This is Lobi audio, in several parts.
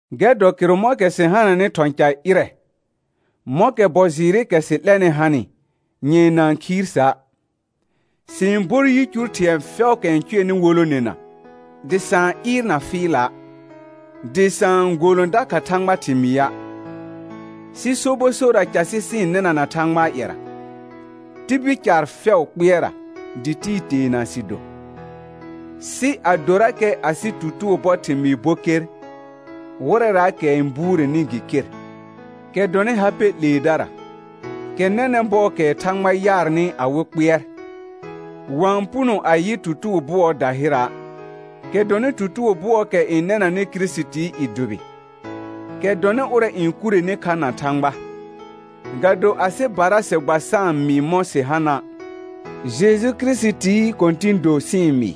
Gɛr dɔ kɩrʋ mɔ̃kɛ sɩ hananɩ thɔ̃ ca ƴɩrɛ, mɔ̃kɛ bɔ jɩɩrɩkɛ sɩ 'lɛnɩ hanɩ, nyɛ̃ɛ na-n khiir sa'. Sɩ-n bor yicur thɩ̃ɛ fɛʋʋkɛ n cʋɛnɩ wolonena, dɩ sa-n ɩɩrna fɩɩla', dɩ sa-n golõ dakha Thãgbaa thɩmɩa', sɩ sobɔ sorra casɩ sɩ-n nɩnana Thãgbaa ƴɛra, tibil caar fɛʋʋ kpɩɛrra, dɩ tibil teena sɩ do. Sɩ adorakɛ asɩ tutugo bɔ thɩmɩɩ bo ker, wɩrɛraakɛ n buureni gɩ ker, kɛ dɔnɩ ha pɛ 'leedara, kɛ nɛnɛ̃ bɔɔkɛɛ thãgba yaarnɩ awɩ kpɩɛr, wa-n puno a yɩ tutugo bʋɔɔ dahɩra', kɛ dɔnɩ tutugo bʋɔɔkɛ n nɛnanɩ Kirisitii i dʋbɩ, kɛ dɔnɩ ʋrɛ n kureni kha na Thãgba. Ga do asɩbara sɩ gba sa-n mɩɩ mɔ̃ sɩ hana', Jeju Kirisitii Kɔ̃tɩ̃ do sɩ-n mɩɩ,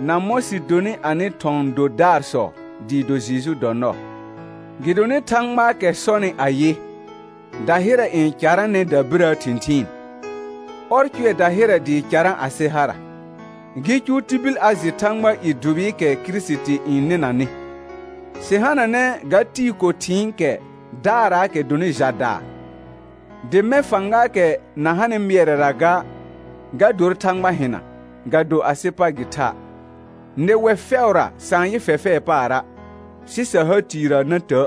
na mɔ̃ sɩ donɩ anɩ thɔ̃ dodaarsɔ dɩɩ do Jeju dɔ nɔɔ. Gɩdonɩ Thãgbaakɛ sɔnɩ ayɩ, dahɩrɛ n caranɛ dabirəə thɩ̃thɩɩn, ɔr cʋɛ dahɩrɛ dɩɩ carã asɩ hara, gɩ cʋʋ tibil a jɩ Thãgbaa i dʋbɩɩkɛ Kirisiti n nɩnanɩ. Sɩ hananɛ ga tɩɩ ko thɩ̃ɩkɛ daaraakɛ dɔnɩ ja daa, dɩ mɛ̃ fãgaakɛ na hanɩ mɩɛrɛra ga, ga dor Thãgba hɩna, ga do asɩ pa gɩ tha'. Nɩwɛ fɛʋra sa-n yɩ fɛfɛɛ paara', sɩ sa ha tiirrə na tə'.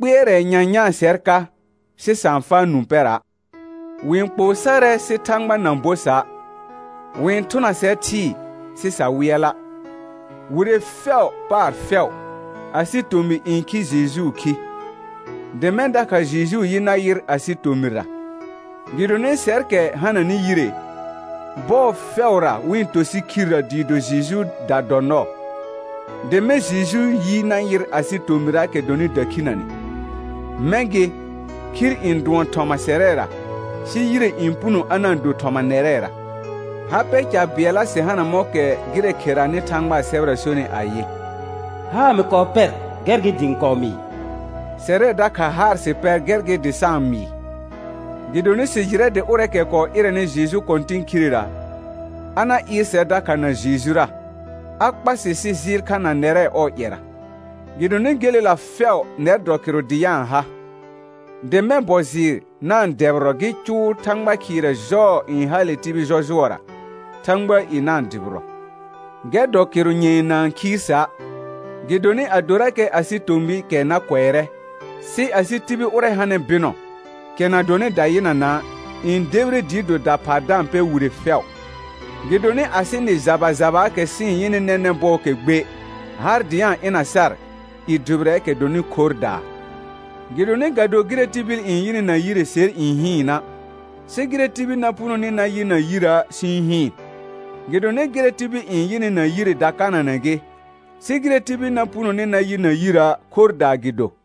Kpɩɛrɛ nyanyãa sɛr ka, sɩ sa-n faa nũ pɛra'. Wɩ-n kpoo sarɛ sɩ Thãgba na bo sa'. Wɩ-n thʋna sɛr thɩɩ, sɩ sa wɩɛla'. Wire fɛʋ paar fɛʋ, asɩ tomɩ n khi Jejuu khi, dɩ mɛ̃ dakha Jejuu yi na yɩr asɩ tomɩra. Gɩdonɩ sɛrkɛ hananɩ yire, bɔɔ fɛʋra wɩ-n to sɩ khirrə dɩɩ do Jejuuda dɔ nɔɔ, dɩ mɛ̃ Jejuu yi na yɩr asɩ tomɩraakɛra dɔnɩ dakhinəne. Mɛ̃ gɩ, khir n dʋɔn thɔma sɛrɛra, sɩ yire n puno a na-n do thɔma nɛrɛra. Ha pɛ ca bɩɛlla sɩ hana mɔ̃kɛ gɩrɛ kheranɩ Thãgbaa sɛbɛra sonɩ ayɩ: «Haar mɩ kɔɔ pɛr, gɛr gɩ dɩ ɩ̃ kɔɔ mɩɩ», sɛrɛ dakha haar sɩ pɛr gɛr gɩ dɩ sa-n mɩɩ. Gɩdonɩ sɩ jɩrɛ dɩ ʋrɛɛkɛ kɔɔ ɩrɛnɩ Jeju Kɔ̃tɩn khirera, a na ɩɩr sɛr dakha na Jejura, a kpa sɩ sɩ jɩɩl kha na nɛrɛ ɔɔ ƴɛra. Gɩdonɩ gelela fɛʋ nɛr dɔ kɩrʋ dɩ a-n ha, dɩ mɛ̃ bɔ jɩɩr na-n dɛbɩrɔ gɩ cʋʋ Thãgba khɩɩrɛ jɔɔ n hale tibil jɔjʋɔra, Thãgbaa i na-n dʋbɩrɔ. Gɛr dɔ kɩrʋ nyɛ̃ɛ na-n khiir sa', gɩdonɩ adorakɛ asɩ tomɩɩkɛ na kʋɛrɛ, sɩ asɩ tibil ʋrɛ hanɩ bɩnɔ, kɛ na dɔnɩ dayɩnana', n debire dɩ do daphaa da-n pɛr wire fɛʋ. Gɩdonɩ asɩ nɩ jaba jabaakɛ sɩ-n yɩnɩ nɛnɛ̃ bɔɔkɛ gbe, har dɩ a-n ɩna sar i dʋbɩrɛɛkɛ dɔnɩ khorrdaa. Gɩdonɩ ga do gɩrɛ tibil n yɩnɩ na yire ser n hɩɩna', sɩ gɩrɛ tibil na punoni na yɩ na yirə' sɩ-n hɩɩn. Gɩdonɩ gɩrɛ tibil n yɩnɩ na yire dakananɛ gɩ, sɩ gɩrɛ tibil na punoni na yɩ na yirə' khorrdaa gɩ do.